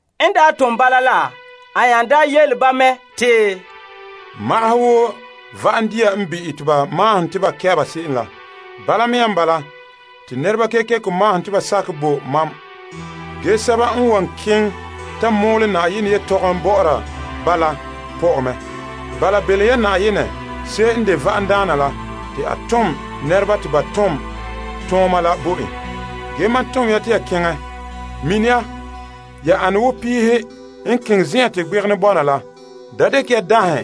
En tom ba bala la, a nya daa yele ba mɛ te, Magahɛ wo va'am dia n bi'ɛ te ba mahona te ba kɛ' se'em la, bala mea n bala te nɛreba kekeko mahona te ba sakɛ bo mam. Ge sɛba n wan keŋɛ ta mɔɔla Na'ayenɛ yelehom bɔ'ɔra ba la pɔ'ɛ mɛ. Bala belom ya Na'ayenɛ n de va'amdaana la te a tom nɛreba te ba ton tooma la bo en. Ge mam tom ya te ya keŋɛ. Mina ya, ya ane wo piihe n keŋɛ zen'an te gbegenɛ bɔna la. Da dekɛ ya daŋhe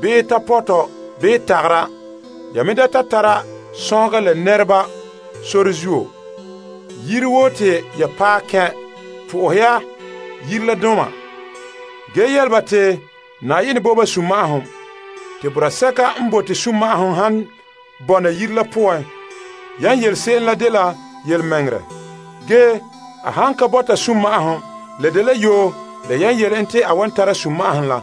bii tapɔtɔ bii tagara, ya me da ta tara sɔnhega la nɛreba sore zuo. Yire woo te ya paɛ kɛn' po'ohɛ ya yire la doma, ge yele ba te, Na'ayenɛ bo ba sunma'ahom. Te boraa sɛka n bote sunma'ahom han bɔna yire la poan yan yele se'em la dela yelemɛŋɛrɛ. Ge a han ka bɔta sunma'ahom la dela yoo la yan yele en te a wan tara sunma'ahom la.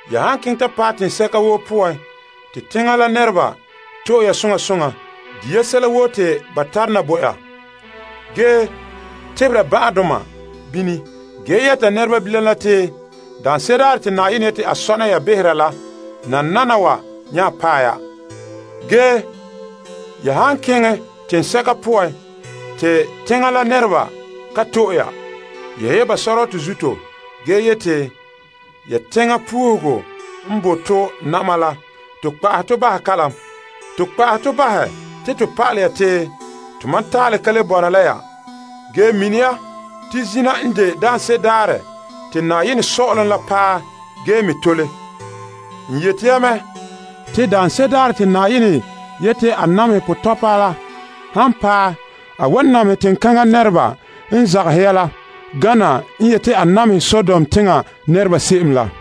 Ya han keŋɛ ta paɛ teŋsɛka woo poan te teŋa la nɛreba to'e ya soŋa soŋa di' ya sɛla woo te ba tare na bo ya, ge tebera ban'ahedoma bini ge yɛta nɛreba bilam la te, Daanse'ere daarɛ te Na'ayenɛ yete a sɔna ya behera la nananawa nya paɛ ya. Ge ya han keŋɛ teŋsɛka poan te teŋa la nɛreba ka to'e ya, yehe ba sɔrɔtɔ zuto ge yeti, Ge ya teŋa puuhugo n boe to na'ma la to kpa'ahɛ to bahɛ kalam. To kpa'ahɛ to bahɛ te to pa'alɛ ya te tomam taalɛ ka le bɔna la ya. Ge mini ya te zina n de daanse'ere daarɛ te Na'ayenɛ Sɔ'ɔlom la paɛ ge me tole. N yete ya mɛ. Te daanse'ere daarɛ te Na'ayenɛ yete a namehɛ potɔpa la han paɛ a wan namehɛ teŋkaŋa nɛreba n zagahɛ ya la gana n yeti a namehɛ Sodom teŋa nɛreba se'em la.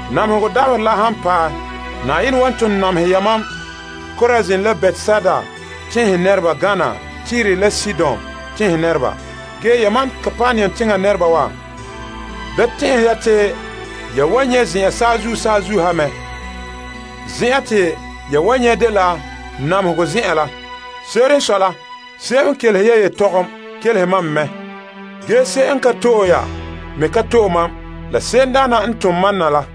Namehegɔ dabaherɛ la han paɛ, Na'ayenɛ wan ton namehɛ yamam Korazin la Betsaida teŋhe nɛreba gana Tire la Sidon tenhen nɛreba. Ge yamam Kapernaum teŋa nɛreba wa, da tɛn'ɛhe ya te ya wan nyɛ' zen'an saazuo saazuo ha mɛ. Zen'an te ya wan nyɛ' dela namehegɔ zen'en la. Se'em n kelehe ya yelehom kelehe mam me mɛ. Ge se'em n ka to'e ya me ka to'e mam la se'emdaana n tom mam na la.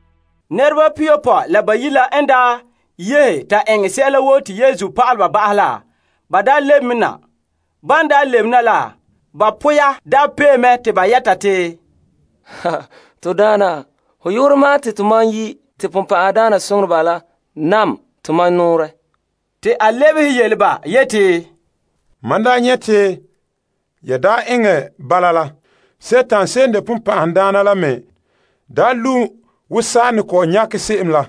Nɛreba pihiyopɔe la bayi' la n daa yehe ta eŋɛ sɛla woo te Yesu yele ba ba'ahɛ la, ba daa lebe me na. Ban lebena la, ba poya pee mɛ te ba yɛta te, To Daana, ho yu'urɛ ma'an te tomam yi' ge te bonbɛ'ɛhe naam tomam nɔɔrɛ. Te a lebehe yele ba yeti, Mam nyɛ' te yan eŋɛ bala la, Dima la lu' wo saa n ne kɔ'ɔn nyakɛ se'em la.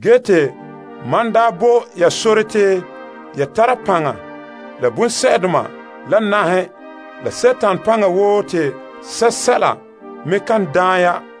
Ge te mam bo ya sore te ya tara paŋa la bonsɛ'doma la naŋhe, la Dima paŋa woo te sɛla me kan daan ya.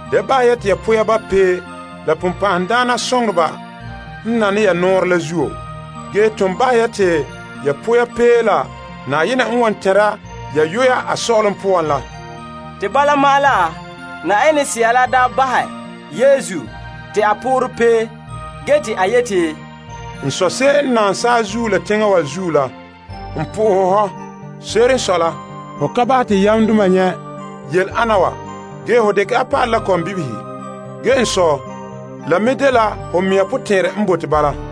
Da bahɛ ya te ya poya ba' pee la bonbɛ'ɛhe n nane ya nɔɔrɛ la zuo. Ge ton bahɛ ya te ya poya pee la Na'ayenɛ n wan tɛnra ya yuya a Sɔ'ɔlom poan la. Te bala ma'an la, Yenɛ Sea la bahɛ Yesu te a poorɛ pee te a daa yeti, N Sɔ' se'em n naam saazuo la teŋa wa zuo la, n bo hɔ fara. Se'ere n sɔe la, ho ka bahɛ te yamdoma nyɛ' yele ana wa, ge ho dekɛ a pa'alɛ la kɔmbibihe. Ge n Sɔ', la me dela ho mɛŋa sunboolom n bala.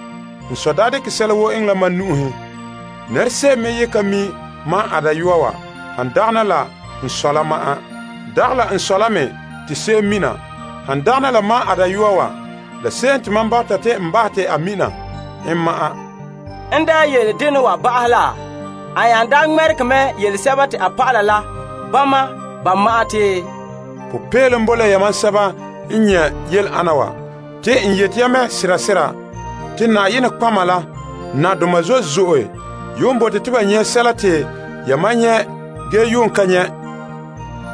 N Sɔ' dekɛ sɛla woo eŋɛ la mam nu'uhen. Nɛra se'em me ye ka mi' a Dayɔa wa han dagana la n Sɔ' la ma'an. Dagɛ la n Sɔ' la me te se'em mina han dagana la a Dayɔa wa la se'em te mam bɔta te n bahɛ en te a mina en ma'an. En yele dena wa ba'ahɛ la, a nya ŋmɛregɛ mɛ yele a dɔlɔba la bama ba ma'an te, Popeelom bo la yamam sɛba n nyɛ' yele ana wa. Te n yete ya mɛ sera sera. Te nɔtɔgɔheba la nadoma zo'e zo'e yuun bote te ba nyɛ' sɛla te yamam nyɛ' ge yuun ka nyɛ'.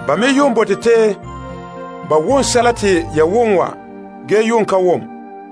Ba me yuun bote ba wom sɛla te ya wom wa ge yuun ka wom.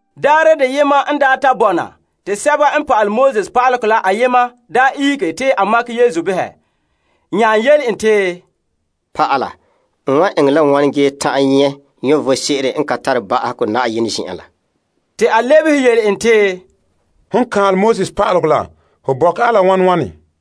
Daarɛ deyema n ta bɔna te pa'alegɔ pa'aleba la ayema ihege te a makɛ Yesu behɛ, nya yele en te, Pa'ala, n wa eŋɛ la wane ge ta'an nyɛ' vom sebo n ka tare ba'ahegɔ Na'ayenɛ zen'en la? Te a lebehe yele en te, Hon kaanlɛ Pa'alegɔ la ho bɔkɛ a la wane?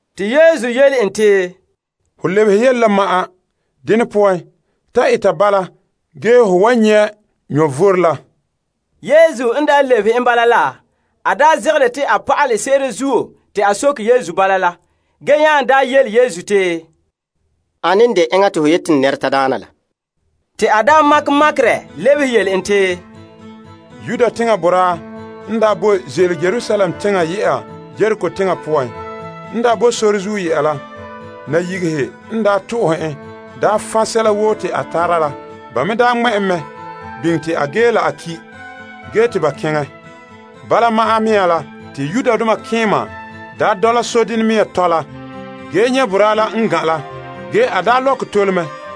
Te Yesu yele en te, Ho lebehe yele la ma'an. Dene poan ta eta bala ge ho wan nyɛ' vom la. Yesu n lebehe en bala la, a zegere te a pa'alɛ se'ere zuo te a soke Yesu bala la, ge nya yele Yesu te, Ane n de enŋa te ho yete n tadaana la? Te Yesu lebehe yele en te, Yuda teŋa boraa n boe ze'ele Yerusalem teŋa yɛ'a Yeriko teŋa poan. N boe sore zuo yɛ'a la, nayigehe n to'ohɛ n fan' sɛla woo te a tara la. Ba me ŋmɛ' en mɛ biŋe te a ge la a ki' ge te ba keŋɛ. Bala ma'an me la, te malemadaana dole sodenɛ mea me dɔla ge nyɛ' boraa la n gan' la. Ge a lɔkɛ tole.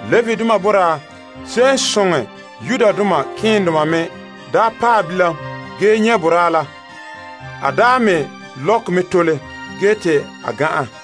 Levidoma boraa me n paɛ bilam ge nyɛ' boraa la, a me lɔkɛ mɛ tole ge te a gan'an.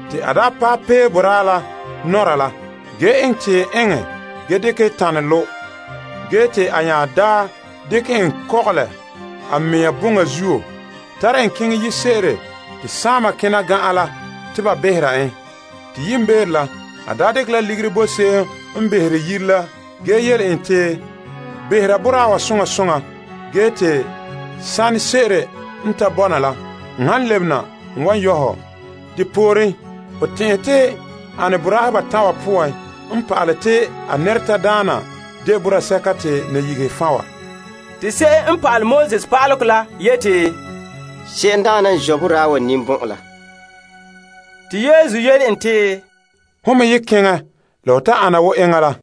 Te a paɛ pee boraa la nɔra la ge eŋɛ tiim eŋɛ a ge dekɛ tanɛ lo'. Ge te a nya dekɛ en kɔgɔlɛ a mea boŋa zuo tare en keŋɛ yire se'ere te saama kena gan'an behera en. Te yiimbeere la, a dekɛ la ligiri bo se'em n behere yire la ge yele en te, Behera boraa wa soŋa soŋa ge te sanɛ se'ere n ta bɔna la, n han lebena n wan yɔ' hɔ. Depooren, ho tɛn'ɛhe te ane boraahe batan' wa poan n pa'alɛ te a nɛretadaana de boraa sɛka te nayigehe fan' wa? Te pa'alegɔ pa'aleba lebehe en yeti, Se'emdaana n zɔ' boraa la ninbɔn'ɔn la. Te Yesu yele en te, Hon me ye keŋɛ la ho ta ana wo eŋɛ la.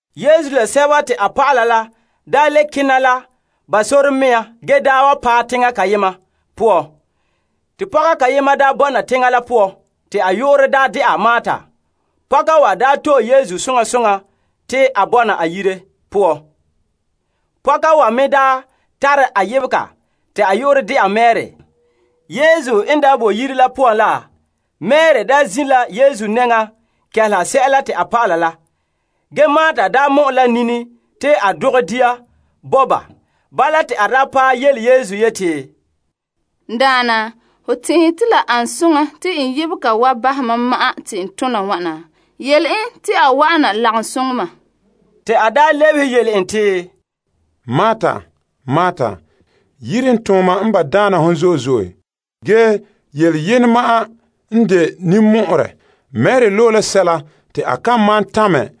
Yesu la a dɔlɔba la nya le kena la ba sɔrɔɔ mea ge wa paɛ teŋa kayema poan. Te pɔka ayema bɔna teŋa la poan, te a yu'urɛ de'a Marta. Pɔka wa to'e Yesu soŋa soŋa te a bɔna a yire poan. Pɔka wa me tare a yebega te a yu'urɛ de'a Mari. Yesu n boe yire la poan la, Mari daa zin' la Yesu nɛŋa kɛleha sɛla te a pa'ala la. Ge Marta mɔ'ɛ la nini te a dogɛ dia bo ba. Bala te a paɛ yele Yesu yeti, N Daana, hon tɛn'ɛhe te la ane soŋa te n yebega wa bahɛ mam n ma'an te n tona wana? Yele en te a wa'ana lagom soŋɛ mam. Te to Daana lebehe yele en te, Marta, yiren tooma yele n ba' daana hɔ. Ge yele yenɛ ma'an n de ninmɔ'ɔrɛ. Mari loe la sɛla te a kan malom tamɛ.